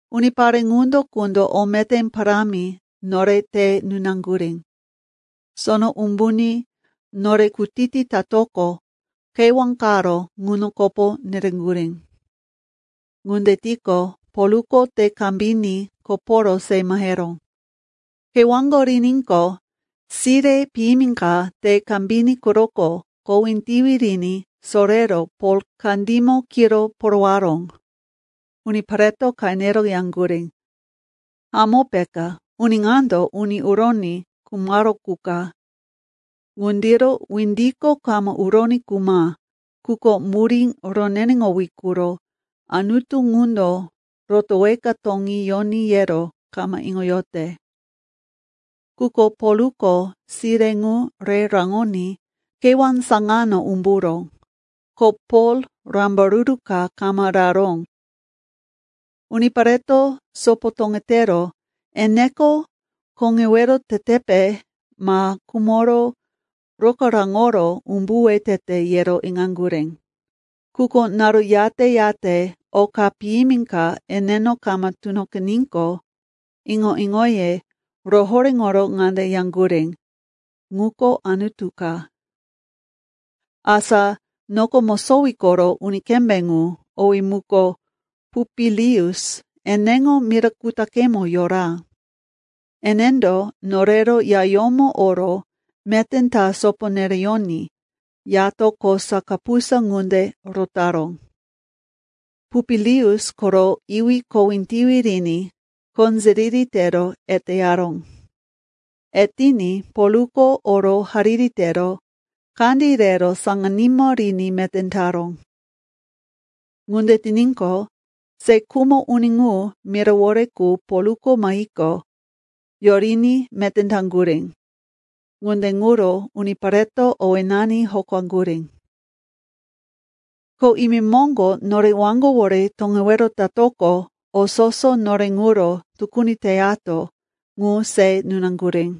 Unipare ŋuno qundo o meté parámi nore te nunaŋgurí. Sono umbuní nore kutiti tatoqo, kewá qaro ŋuno kopo nereŋgurí. Ŋunde tiqo, Polko te kambiní koporo se maheró. Kewáko riníqo, sire piyimi ka te kambiní quroko kowí tiwi riní sorero Pol kandímo kiro porowaró. Unipareto qenero yaŋgurí, “Hamó peka, uni ŋando uni uroní khumaró qu ka. Ŋundiro windiko kama uroní khuma, quko murí roneneŋowí quro anutu ŋundo rotoweka toŋí yoní yero kama iŋoyote.” Quko Polko sire ŋu re raŋoní kewá saŋano umburó, ko Pol rambaruru ka kama raró. Unipareto sopo toŋetero, eneko koŋewero tetepe ma khumoro rokaráŋoro umbuwe tete, yero iŋaŋgurí. Quko naru yate-yate oka piyimi ka eneno kama tunoqiníqo, iŋo-iŋoye rohoréŋoro ŋande yaŋgurí, “Ŋuko anutu ka.” Asa noko mosowí koro uni kembé ŋu, owí muko Pupilius, eneŋo mira kutaqemo yora. Enendo norero yayómo oro meté ta sopo nereyoní yato kosa kapusa ŋunde rotaró. Pupilius koro iwí kowí tiwi riní qonziriri tero eteyaró. Etiní Polko oro hariri tero kandí rero saŋanímo riní meté taró. Ŋunde tiníqo, se khumo uni ŋu mirawore qu Polko mahiqo, yoriní meté taŋgurí. Ŋunde ŋuro unipareto owénani hokaŋgurí. Ko imemoŋgo nore waŋgowore toŋewero tatoqo, o soso nore ŋuro tukuni teyato ŋu se nunaŋgurí.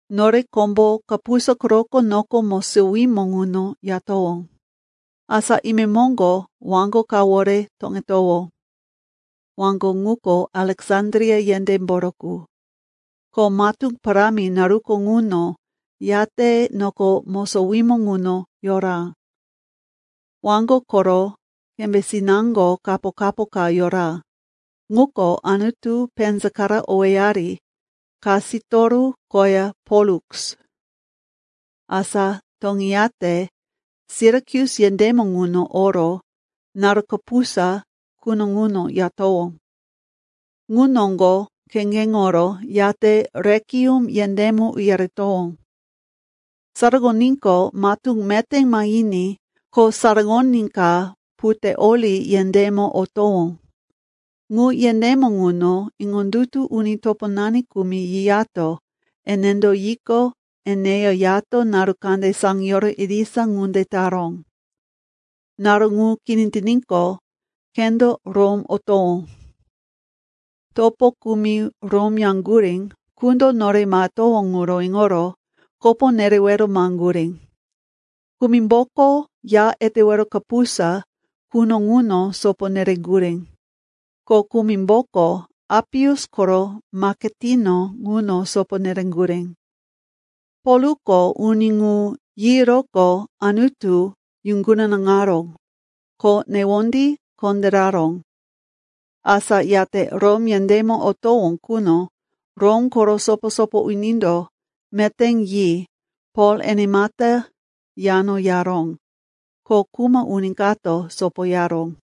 Nore kombo kapusa quroko noko mosowímo ŋuno yatowó. Asa imemoŋgo waŋgo kawore toŋetowó. Waŋgo ŋuko Aleksandria yendémboro qu, ko matú parámi naruko ŋuno yate noko mosowímo ŋuno yora. Waŋgo koro kembésinaŋgo kapo-kapo ka yora, ŋuko anutu penzakara owéyari Kasitoru koya Poluks. Asa toŋeyate Sirakus yendémo ŋuno oro naru kapusa quno ŋuno yatowó. Ŋu noŋgo kheŋgeŋoro, yate Rekium yendémo uyaretowó. Saraŋoníqo, matú meté mahiní ko saraŋoní ka Puteoli yendémo otowó. Ŋu yendémo ŋuno iŋondutu uni toponani kumi yiyato enendo yiqo, eneya yato naru kande saŋiyoro irisa ŋunde taró. Naru ŋu kini tiníqo, khendo Rom otowó. Topo kumi Rom yaŋgurí qundo nore mahetowó ŋuro iŋoro kopo nerewero maheŋgurí. Kumimboko Ya Etewero Kapusa quno ŋuno sopo nereŋgurí, ko kumimboko Apius koro maketino ŋuno sopo nereŋgurí. Polko uni ŋu yiyoroqo Anutu yuŋgunaŋaró, ko newondí kondéraró. Asa yate Rom yendémo otowó quno Rom koro sopo-sopo unindo meté yi Pol enemata yano yaró, ko kuma uni kato sopoyaró.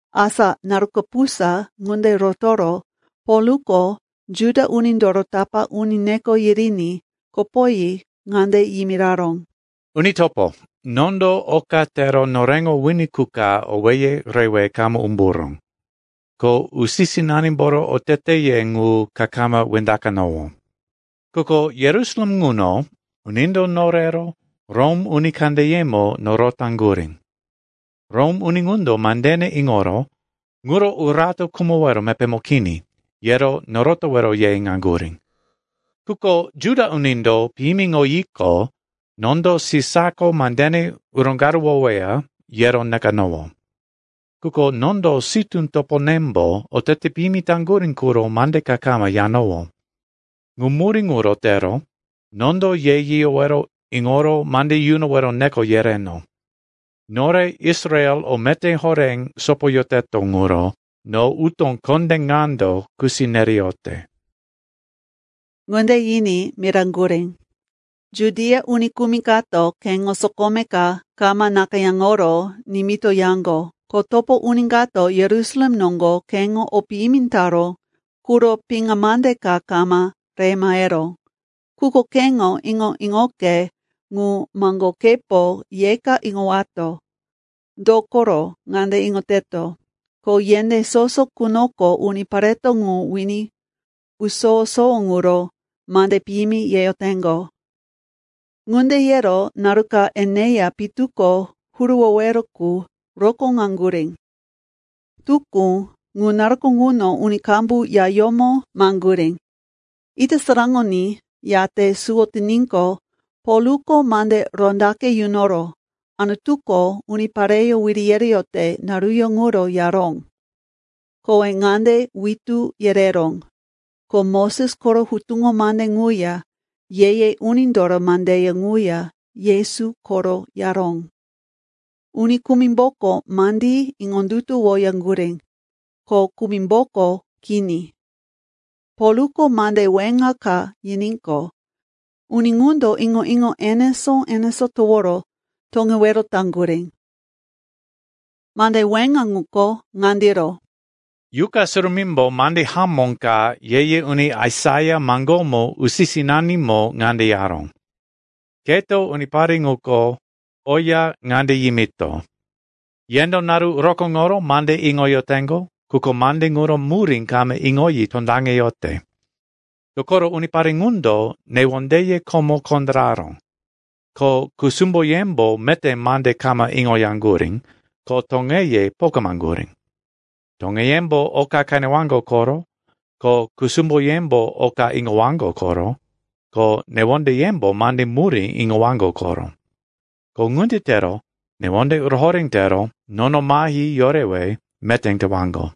Asa naru kapusa ŋunde rotoro Polko Juda unindoro tapá uni neko yiriní kopoyi ŋande yimiraró, “Uni topo, nondo oka tero noreŋo wini qu ka owéye rewe kama umburó, ko usi-sinanimboro oteteye ŋu ka kama wendaqanowó. Quko Yerusalem ŋuno unindo norero Rom uni kandeyemo norotaŋgurí. Rom uni ŋundo mandene iŋoro, ŋuro urato khumowero mepémo kini, yero norotowero ye iŋaŋgurí. Quko Juda unindo piyimiŋoyiqo, nondo Sisako mandene roŋgaruwoweya, yero nekanowó. Quko nondo sitú toponembo otete piyimi taŋgurí quro mande ka kama yanowó. Ŋu murí ŋuro tero nondo ye yiyowero iŋoro mande yunowero neko yereno. Nore Israel o meté horé sopoyoteto ŋuro no utó kondé ŋando kusi nereyote.” Ŋunde yiní miraŋgurí, “Judia uni kumi kato keŋo sokome ka kama nakayáŋoro nimitoyaŋgo, ko topo uni kato Yerusalem noŋgo keŋo o piyimi taró quro piŋa mande ka kama re maheró. Quko keŋo iŋo-iŋoke ŋu maŋgokepo yeka iŋowato. Dokoro ŋande iŋoteto, ko yendé soso qunoko unipareto ŋu wini usowo-sowo ŋuro mande piyimi yeyoteŋgo.” Ŋunde yero naru ka eneya pitu ko huruwowero qu rokóŋaŋgurí. Tukú, ŋu naruko ŋuno uni qambu yayómo maheŋgurí. Ita saraŋoní, yate suwo tiníqo, Polko mande rondaqe yunoro Anutuko unipareyó wiri yereyote naruyó ŋuro yaró. Kowe ŋande witú yereró, ko Moses koro Hutuŋo Mande ŋuya Ye-ye Unindoro mandeye ŋuya Yesu koro yaró. Uni kumimboko mandí iŋondutuwoyaŋgurí, ko kumimboko kini. Polko mande weŋa ka yiníqo, uni ŋundo iŋo-iŋo enesó-enesó toworo toŋewero taŋgurí. Mande weŋa ŋuko ŋandiro, “Yuqa Surumímbo mande hamó ka ye-ye uni Aisaia maŋgómo usi-sinanimo ŋande yaró, “Keto unipare ŋuko oya ŋande yimito, ‘Yendo naru rokóŋoro mande iŋoyoteŋgo, quko mande ŋuro murí kama iŋoyi tondaŋeyote. Dokoro unipare ŋundo newondeye komo kondéraró, ko kusumboyembo meté mande kama iŋoyaŋgurí, ko toŋeye pokamaŋgurí. Toŋeyembo oka qenewaŋgo koro, ko kusumboyembo oka iŋowaŋgo koro, ko newondeyembo mande murí iŋowaŋgo koro. Ko ŋunde tero newonde rohoré tero nono mahi yorewe meté tewaŋgo.’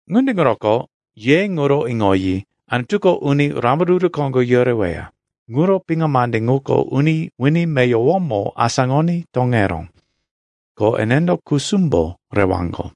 “Ŋunde ŋuroko ye ŋuro iŋoyi, Anutuko uni rambaruru koŋgo yoreweya, ŋuro piŋa mande ŋuko uni wini meyowomo asáŋoní toŋeró. Ko enendo kusumbo rewaŋgo.”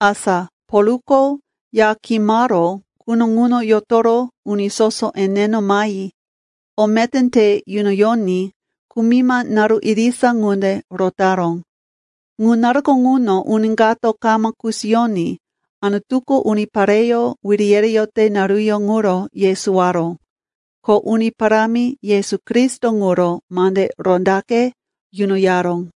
Asa Polko ya kimaró quno ŋuno yotoro uni soso eneno mahi o meté te yunoyoní kumima naru irisa ŋunde rotaró. Ŋu naruko ŋuno uni kato kama kusiyoní Anutuko unipareyó wiri yereyote naruyó ŋuro yesowaró, ko Uni Parámi Yesu Kristo ŋuro mande rondaqe yunoyaró.